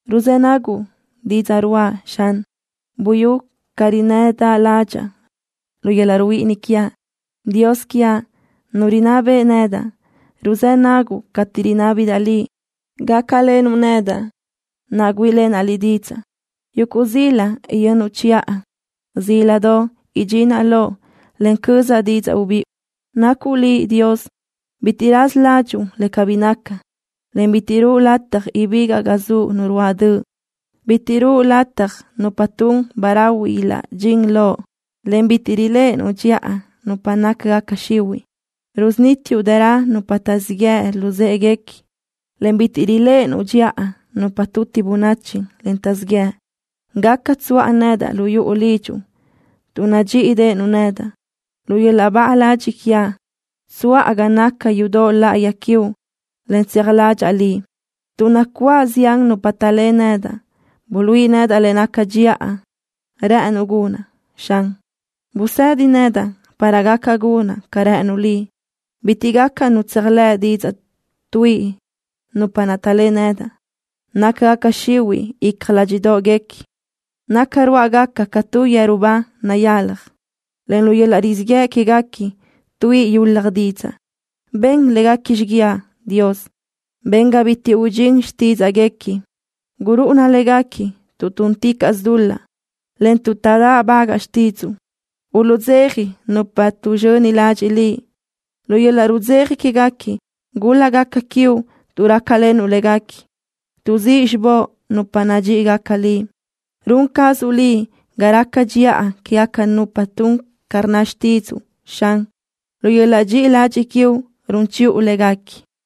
Ruzë́ naguʼ didzaʼ ruáʼa, Xan. Buyú ca rinnëdaʼ ládxaʼa lu yöl-laʼ ruhuíʼini quiaʼ. Dios quiaʼ, Nu rinná beʼe nedaʼ, ruzë́ naguʼ cateʼ rinábidaʼ Liʼ gácalenuʼ nedaʼ, naʼ güíʼilenaʼ Liʼ didzaʼ. Yuguʼ zila yönnuʼ chiʼa. Zíladoʼ idxinaʼ loʼ, en cözaʼ didzaʼ ubiʼu. Nacuʼ Liʼ Dios bitiʼ raza ládxuʼu le cabí naca, en bitiʼ ruʼu lataj ibigaʼ ga zuʼ nu ruáʼ döʼ. Bitiʼ ruʼu lataj nupa tun ba rahui ilaʼdxín loʼ, en bitiʼ riléʼenuʼ dxiʼa nupa nácagaca xihuiʼ. Rusunítiuʼ dërö nupa taʼzíʼ yeʼe luzë́ʼeguequi, en bitiʼ riléʼenuʼ dxiʼa nupa tuti bönachi, en taʼzíʼ yëʼ. Gaca tsuʼa nedaʼ lu yuʼu lidxuʼ, tuʼ nadxíʼideʼenuʼ nedaʼ. Lu yöl-laʼ baʼa ladxiʼ quiaʼ tsuʼa ga naca yudoʼ láʼayi quiuʼ, en tseaj ládxaʼa Liʼ. Tuʼ nacuáʼ zián nupa taʼlé nedaʼ, buluíʼi nedaʼ le naca dxiʼa rë́ʼënuʼ gunaʼ, Xan. Busëdi nedaʼ para gaca gunaʼ ca rë́ʼënuʼ Liʼ. Bitiʼ gaca nu tseajlë́ʼ didzaʼ tuíʼi nupa naʼ taʼlé nedaʼ. Nácagaca xihuiʼ icja ládxiʼdoʼguequi. Naca ruáʼagaca ca tu yeru ba nayalaj, en lu yöl-laʼ rizíʼ yëʼ quéguequi tuíʼi yulaj didzaʼ. Ben léguequi xiguiaʼ, Dios. Ben ga bitiʼ udxín xtídzaʼguequi. Gurúʼuna léguequi tuʼ túnticaʼsö dul-laʼ, en tuʼ taʼdáʼbagaʼ xtídzuʼu. Uluʼdzeja nupa tuʼzxöni ladxiʼ Liʼ. Lu yöl-laʼ rudzeja quéguequi gúl-lagaca quiuʼ tuʼ rácalenuʼ léguequi. Tuʼzíʼ xibóʼ nupa nadxíʼigaca Liʼ. Run cazuʼ Liʼ ga raca dxiʼa quégaca nupa tun ca rnna xtídzuʼu, Xan. Lu yöl-laʼ dxiʼi ladxiʼ quiuʼ run chiʼu léguequi.